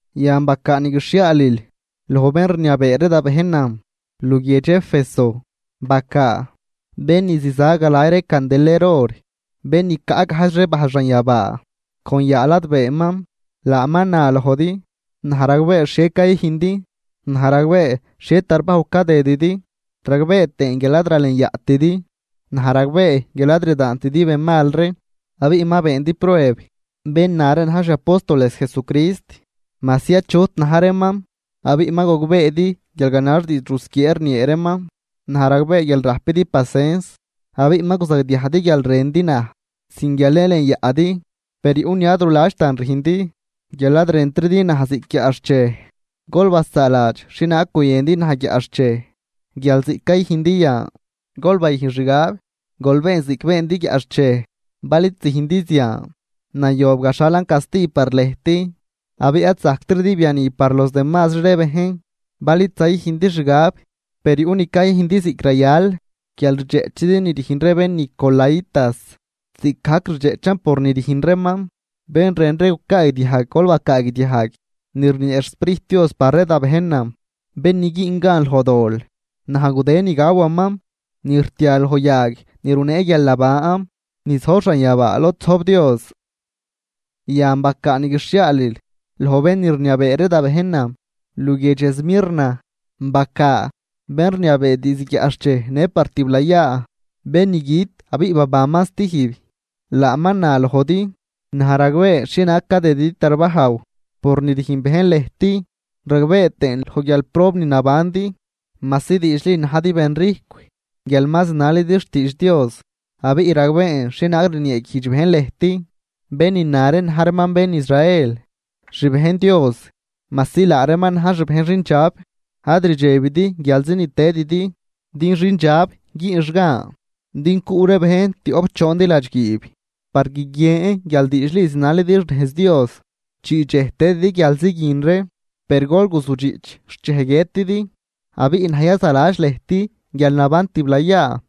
’Yan bacaa ni guixhiaalil loj bén rniabee ree da bejnan luguiedx Éfeso. Bacaa: “Bén ni ziza galay ree candeler or, bén ni caꞌ gajdx ree bajl xanyabaa con yaa ladbeeman, laaman na lojdi: Naj ragbee xhie cayüjndi. Naj ragbee xhie tarbajw cadëdidi, ragbee tëën guial ad ralenyaꞌtidi. Naj ragbee guial ad rdaantidi bén mal ree, abiꞌ ma beendi prueb bén na ree na̱j xi apóstoles Jesucrist majsi achut na̱j reeman abiꞌ ma gogbeedi guial ganax diidx rusquiee rniee reeman. Naj ragbee guial rajpidi pacens abiꞌ ma guzagdiajdi guial rëndi naj sin guial yalenyaꞌdi. Per yuꞌ ni ad ruladxtan rüjndi: guial ad rëntridi naj ziꞌc guiaꞌxchej. Gol basaaladx xhienaag guyëndi naj guiaꞌxchej guial ziꞌc cayüjndi yan. Gol bayüjn xgab, gol been ziꞌc beendi guiaꞌxchej, bal id züjndi zian, nayob gaxhalan casti par lëjt abiꞌ ad zajctridi biani par los demazri ree bejn, bal id zayüjndi xgab. Per yuꞌ ni cayüjndi ziꞌc rayal, guial rdxeꞌchidi ni rüjn ree ben nicolaítas, ziꞌcgajc rdxeꞌchan por ni rüjn reeman. Bén rën ree gucaagdiajg, gol bacaagdiajg ni rniee xSprijt Dios par ree da bejnan: Bén ni güün gan loj dol, naj gudë ni gawaman ni rtia loj yag ni runee guialnaban ni zojb xanyabaa lod zojb Dios.” ’Yan bacaa ni guixhiaalil loj bén ni rniabee ree da bejnan luguiedx Esmirna. Bacaa: “Bén rniabee diizd guiaꞌxchej në par tiblayaa, bén ni güt abiꞌ babanman stijb, laaman na lojdi: Naj ragbee xhienaag cadëdidi tarbajw por ni rüjn bejn lëjt, ragbee tëën loj guialprob ni nabandi majsi diidxli najdi benrijcw guial ma zinalidi xtiidx Dios, abiꞌ ragbeen xhienaag rnieeguijdx bejn lëjt, bén ni na ree na̱j reeman bén Israel xbejn Dios majsi laa reeman na̱j xbejn xindxab. Ad rdxebtidi guialzi ni tëdidi din xindxab güünx gan din cuꞌ ree bejn tioꞌp choondi ladxguiib par guiguien guial diidxli zinalidi xnejz Dios. Chii dxej tëdidi guialzi guin ree, per gol guzujdxiꞌch xt dxej guiëtidi, abiꞌ naj yazaladx lëjt guialnaban tiblayaa.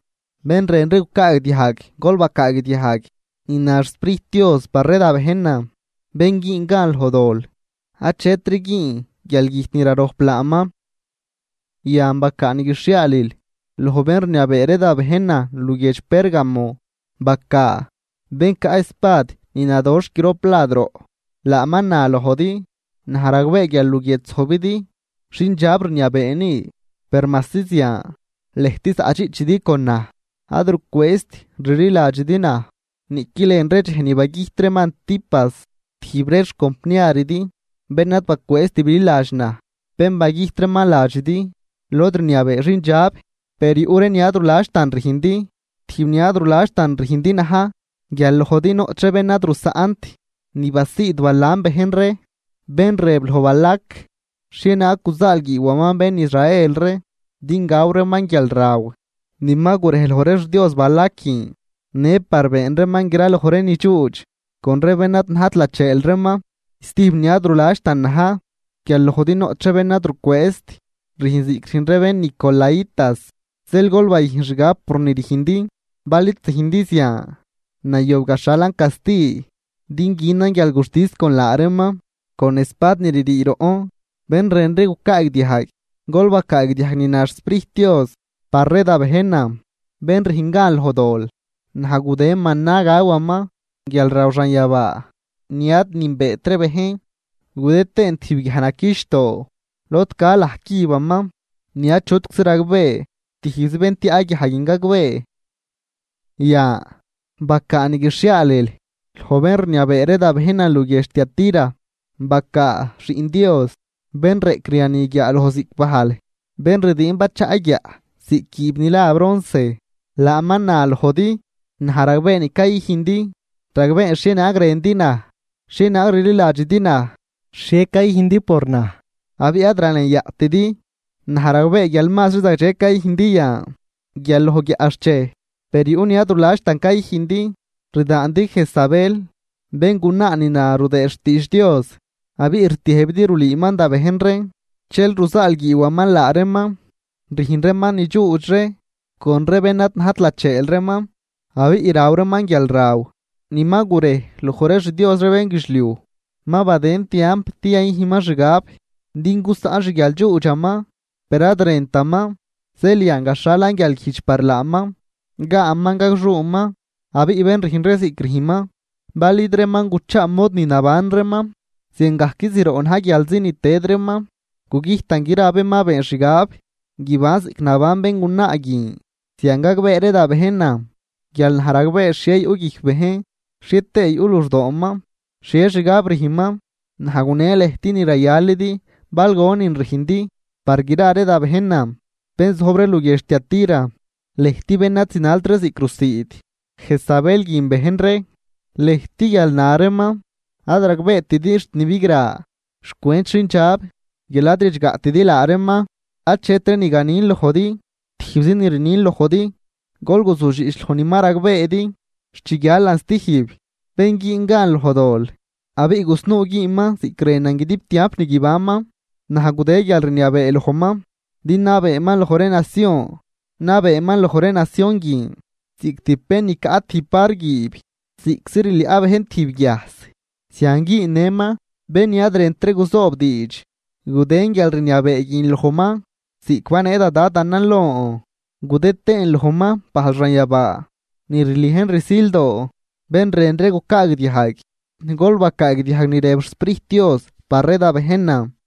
Bén rën ree gucaagdiajg gol bacaagdiajg ni na xSprijt Dios par ree da bejnan: Bén güün gan loj dol, achetri güün guialgüjt ni rarojp laaman.” ’Yan bacaa ni guixhiaalil loj bén rniabee ree da bejnan luguiedx Pérgamo. Bacaa: “Bén caꞌ espad ni nadoxh grop lad roꞌ, laaman na lojdi: Naj ragbee guial luguiedx zojbidi xindxab rniabee ni. Per majsi zian lëjt zaꞌdxiꞌchidi con naj ad rucwëëzt rliladxidi naj niꞌqui lën ree dxej ni bagüjt reeman Antipas, tijb ree xcompniaridi bén ad bacwëëzt bililadx naj, bén bagüjt reeman ladxidi lod rniabee xindxab. Per yuꞌ ree ni ad ruladxtan rüjndi. Tijb ni ad ruladxtan rüjndi na̱j guial lojdi noꞌch ree bén ad rusaꞌnt ni basiid Balaam bejn ree, bén rëb loj Balac xhienaag guzaalguiiwaman bén Israel ree din gaw reeman guialraw ni ma gurej loj ree xdios Balac guin, në par been reeman graloj ree nidxuudx con ree bén ad najt lacheel reeman. Stijb ni ad ruladxtan na̱j guial lojdi noꞌch ree bén ad rucwëëzt rüjn ziꞌc rüjn ree bén nicolaítas. Zeel gol bayüjn xgab por ni rüjndi, bal id züjndi zian nayob gaxhalan casti din günan guialguxtis con laa reeman con espad ni ririi roꞌn. Bén rën ree gucaagdiajg, gol bacaagdiajg ni na xSprijt Dios par ree da bejnan: Bén rüjn gan loj dol, naj gudë mana gawaman, guialraw xanyabaa ni ad nünbeet ree bejn. Gudë tëën tijb guiaj naquichdoo lod ca laj cübaman ni achutczi ragbee, tijbzi bén tiaꞌ guiaj guin gagbee.” ’Yan bacaa ni guixhiaalil loj bén rniabee ree da bejnan luguiedx Tiatira. Bacaa: “Xiꞌn Dios, bén reꞌcriani guiaaloj ziꞌc bajl, bén rdiin bachaꞌ guiaꞌ ziꞌc guiib ni la bronce, laaman na lojdi: Naj ragbee ni cayüjndi, ragbeen xhienaag rëndi naj, xhienaag rliladxidi naj, xhie cayüjndi por naj abiꞌ ad ralenyaꞌtidi. Naj ragbee guial mazri zagdxe cayüjndi yan guial loj guiaꞌxchej, Per yuꞌ ni ad ruladxtan cayüjndi: Rdaandi Jezabel, béngunaa ni na rudëëd xtiidx Dios. Abiꞌ rtiëjbidi rulüüman da bejn reen dxel ruzaalguiiwaman laa reeman rüjn reeman ni dxuudx ree con ree bén ad najt lacheel reeman, abiꞌ raw reeman guialraw ni ma gurej loj ree xdios ree bénguidxliuj. Ma badën tiamp din yayüjnman xgab, din gusaꞌn xguialdxuudxaman, per ad rëntaman. Zeel yan gaxhalan guialguijdx par laaman, gaaman gagxuuman. Abiꞌ bén rüjn ree ziꞌc rüjnman, bal id reeman guchaa mod ni naban reeman ziangajc zroꞌ na̱j guialzi ni tëd reeman, gugüjtan gra ree bén ma been xgab guiban ziꞌc naban béngunaa guin. Zian gagbee ree da bejnan guial naj ragbee xhie yuꞌ guijc bejn xhie tëë yuꞌ luxdooman, xhie xgab rüjnman. Naj gune lëjt ni rayalidi bal gonin rüjndi. Par gra ree da bejnan bén zojb ree luguiedx Tiatira, lëjt bén ad zinalt ree ziꞌc rusiid Jezabel guin bejn ree, lëjt guial na reeman ad ragbeetidi xt ni bigra xcwent xindxab guial ad ridxgaꞌtidi laa reeman, achetri ni ganin lojdi, tijbzi ni rnin lojdi: Gol guzujdxiꞌch loj ni ma ragbeedi xt chi guialan stijb. Bén güün gan loj dol, abiꞌ gusnuu güünman ziꞌc rënan guidib tiamp ni guibanman, naj gudë guialrniabee lojman din nabeeman loj ree nacion. Nabeeman loj ree nacion guin ziꞌc tijb bén ni caꞌ tijb var guiib, ziꞌczi rliaꞌ bejn tijb guiajs zian güünnëman bén ni ad rënt ree guzoob diidx. Gudën guialrniabee guin lojman ziꞌc banee da Dadanan lon, gudë tëën lojman bajl xanyabaa ni rliejn rsildoo. Bén rën ree gucaagdiajg, gol bacaagdiajg ni rëb xSprijt Dios par ree da bejnan.”